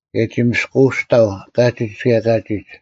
ᑭᔭ ᒋ ᒥᔅᑯᐅᔅᑕᐤ ᑲᒋᒡ ᑭᔭ ᑲᒋᒡ: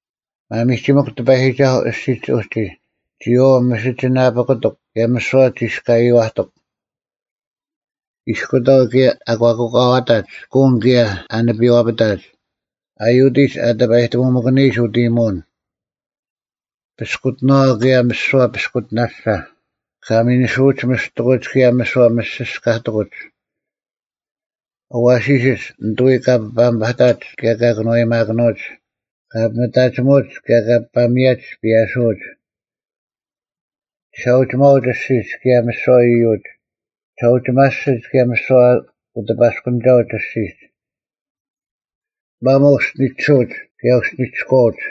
ᒪᒥᒋᒥᐧᒄ ᑎᐸᔨᒋᒐᓱᐤ ᐊᔅᒋᒡ ᐅᒋ, ᒋᔨᐛᐤ ᒥᓯᒋᓇᐱᑯᑐᒄ, ᑭᔭ ᒥᓯᐛ ᒋᔅᑲᔨᐛᑐᒄ; ᐃᔅᑯᑕᐤ, ᑭᔭ ᐊ ᒂᑯᑲᐛᑕᒡ, ᑯᓐ ᑭᔭ ᐊ ᓂᐱᐛᐱᑕᒡ; ᐊ ᔪᑎᒡ ᐊ ᑎᐱᐸᔨᑕᒧᒥᑭᓂᔨᒡ ᐅᑦ ᐃᔨᒧᐅᓐ; ᐱᔅᑯᑎᓇᐛ, ᑭᔭ ᒥᓯᐛ ᐱᔅᑯᑎᓇᓴ; ᑲ ᒥᓂᓯᐅᒡ ᒥᔅᑎᑯᒡ, ᑭᔭ ᒥᓯᐛ ᒪᔅᒋᔅᑲᑎᑯᒡ; ᐊᐛᓯᓯᒡ ᓂᑐᐎᔾ ᑲ ᐱᐸᒥᐸᑕᒡ ᑭᔭ ᑲ ᑭᓄᐛᔨᒪᑭᓄᐅᒡ; ᑲᐱᒥᑕᒋᒧᒡ, ᑭᔭ ᑲ ᐱᐸᒥᔭᒡ ᐱᔭᓱᐅᒡ; ᒋᓴᐅᒋᒪᐅᒡ ᐊᔅᒋᒡ, ᑭᔭ ᒥᓯᐛ ᐃᔪᒡ; ᒋᓴᐅᒋᒪᓯᒡ, ᑭᔭ ᒥᓯᐛ ᐅᑎᐸᔅᑯᓂᒐᐅᒡ ᐊᔅᒋᒡ; ᒪᒧᐤ ᐅᔅᒋᓂᒋᓱᐅᒡ, ᑭᔭ ᐅᔅᒋᓂᒋᔎᐅᒡ;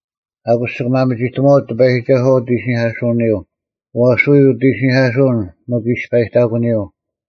ᐊᑯᔅ ᒋᑭ ᒪᒥᒋᑕᒺᐅᒡ ᑎᐸᔨᒋᒐᓱᐛ ᐅᑦ ᐃᓯᓂᐧᑲᓱᐅᓂᔪᐤ: ᐛᔅ ᐎᔾ ᐅᑦ ᐃᓯᓂᐧᑲᓱᐅᓐ ᒥᒄ ᐃᔅᐸᔨᑕᒂᓂᔪᐤ;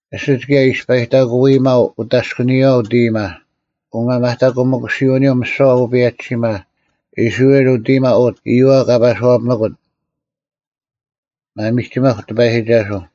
ᐊᓯᒡ ᑭᔭ ᐃᔅᐸᔨᑕᑯᐃᒪᐤ ᐅᑦ ᐊᔅᑲᓂᔨᐛ ᐅᑦ ᐃᔨᒪ, ᐅᒪᒪᑕᑯᒥᑯᓯᐅᓂᔪᐤ ᒥᓯᐛ ᐅᐸᔭᒋᓯᒪ; ᐃᔅᕋᐃᓪ ᐅᑦ ᐃᔨᒪ ᐅᑦ, ᐃᔪᐛ ᑲ ᐸᔄᐱᒥᑯᑦ᙮ ᒪᒥᒋᒥᐧᒄ ᑎᐸᔨᒋᒐᓱᐤ!